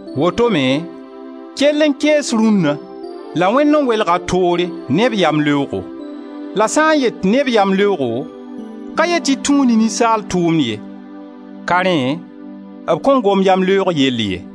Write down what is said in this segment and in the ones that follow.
Woto-me kell n kees rũnna la Wẽnd n welg-a toore ne b yamleoogo. La sã n yet ne b yamleoogo, ka yet tɩ tũu ne ninsaal tʋʋmd ye, ka rẽ b kõn gom yamleoog yell ye.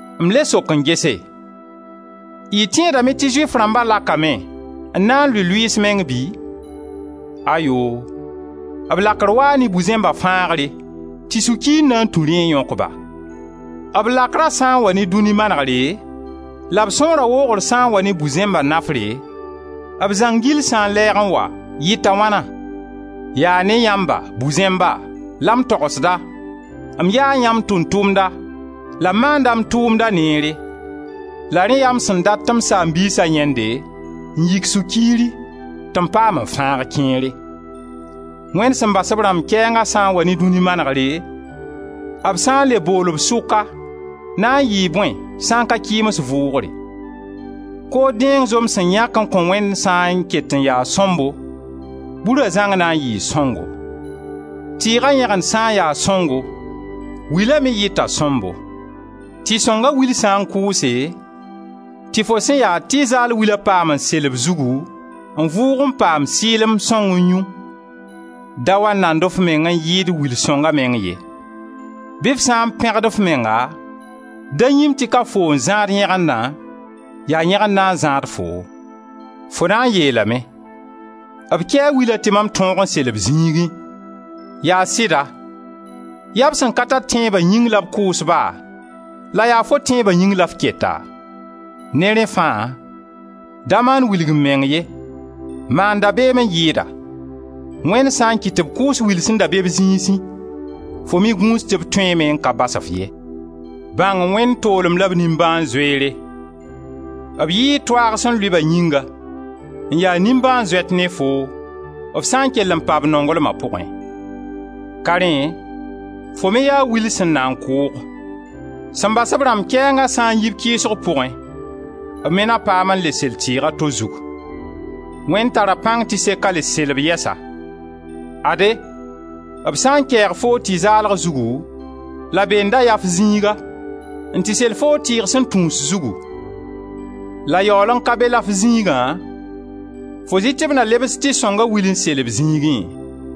M le sok n gese: y tẽedame tɩ Zʋɩf rãmba lakame n na n lʋɩ lʋɩɩs meng bɩ? Ayoo! B lakr waa ne bu-zẽmba fãagre tɩ sũ-kiir na tũ rẽ n yõk-ba. B lakra sã n wa ne dũni manegre, la b sõora woogr sã n wa ne bu-zẽmba nafre, b zãng gill sã n lɛɛg n wa, yita wãna? Yaa ne yãmba, bu-zẽmba, la m togsda, m yaa yãmb tʋʋm-tʋmda, la m maanda m tʋʋmda neere, la rẽ yaa m sẽn dat tɩ m saam-biisa yãende n yik sũ-kiiri tɩ m paam n fãag kẽere. Wẽnd sẽn bas b rãmb kɛɛnga sã n wa ne dũni manegre, b sã n le bool-b sʋka na n yɩɩ bõe sã n ka kɩɩms vʋʋgre? Kood dẽeng zom sẽn yãk n kõ Wẽnd sã n ket n ya sõmbo, bura zãng na n yɩɩ sõngo. Tɩɩga yẽgend sã n ya sõngo, wila me yɩta sõmbo. Tɩ-sõnga wil sã n kʋʋse, tɩ fo sẽn ya tɩ zaal willã paam n sel b zugu n vʋʋg n paam sɩɩlem sõng n yũ, da wa nand f meng n yɩɩd wil sõnga meng ye. Bɩ f sã n pẽgd f menga, da yĩm tɩ ka foo n zãad yẽgendã, yaa yẽgenda n zãad foo. Fo na n yeelame: «B kɛɛ wila tɩ mam tõog n sel b zĩigẽ.» Yaa sɩda, yaa b sẽn ka tar tẽeba yĩng la b kʋʋs-ba, la yaa fo tẽeba yĩng la f keta. Ne rẽ fãa da maan wilg-m-meng ye, maan dabeem n yɩɩda. Wẽnd sã n kɩt tɩ b kʋʋs wil sẽn da be b zĩisẽ, fo me gũus tɩ b tõeeme n ka bas-f ye. Bãng Wẽnd toolem la b nimbãan-zoeere. B yɩɩ toaag sẽn lʋɩ-ba yĩnga, n ya nimbãan-zoet ne foo, f sã n kell n pa b nonglma pʋgẽ; ka rẽ fo me yaa will sẽn na n kʋʋg. Sẽn bas b rãmb kɛɛnga sã n yi b kɩɩsg pʋgẽ, b me na paam n le sel tɩɩg a to zug: Wẽnd tara pãng tɩ seka le sel b yɛsa. Ade, b sã n kɛɛg foo tɩ zaalg zugu, la bee n da ya f zĩiga, n tɩ sel foo tɩɩg sẽn tũus zugu, la yaool n ka be la f zĩigã, fo zɩ tɩ b na lebs tɩ-sõnga wil n sel b zĩigẽ!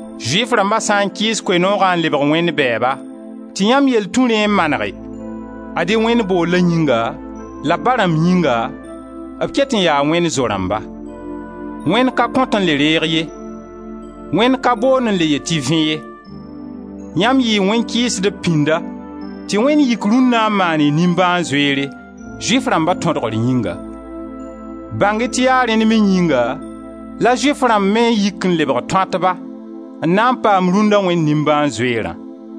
Zʋɩf rãmba sã n kɩɩs Koe-noogã n lebg Wẽnd bɛɛba, tɩ yãmb yell tũ rẽ n manege, ad-y Wẽnd boollã yĩnga, la b ba rãmb yĩnga, b ket n yaa Wẽnd zo-rãmba. Wẽnd ka kõt n le reeg ye, Wẽnd ka boond n le yeel tɩ vẽ ye. Yãmb n yɩ wẽn-kɩɩsdb pĩnda tɩ Wẽnd yik rũnna n maan-y nimbãan-zoeere, Zʋɩf rãmba tõdgr yĩnga. Bãng-y tɩ yaa rẽnd me yĩnga la Zʋɩf rãmb me yik n lebg tõatba, n na n paam rũnna Wẽnd nimbãan-zoeerã.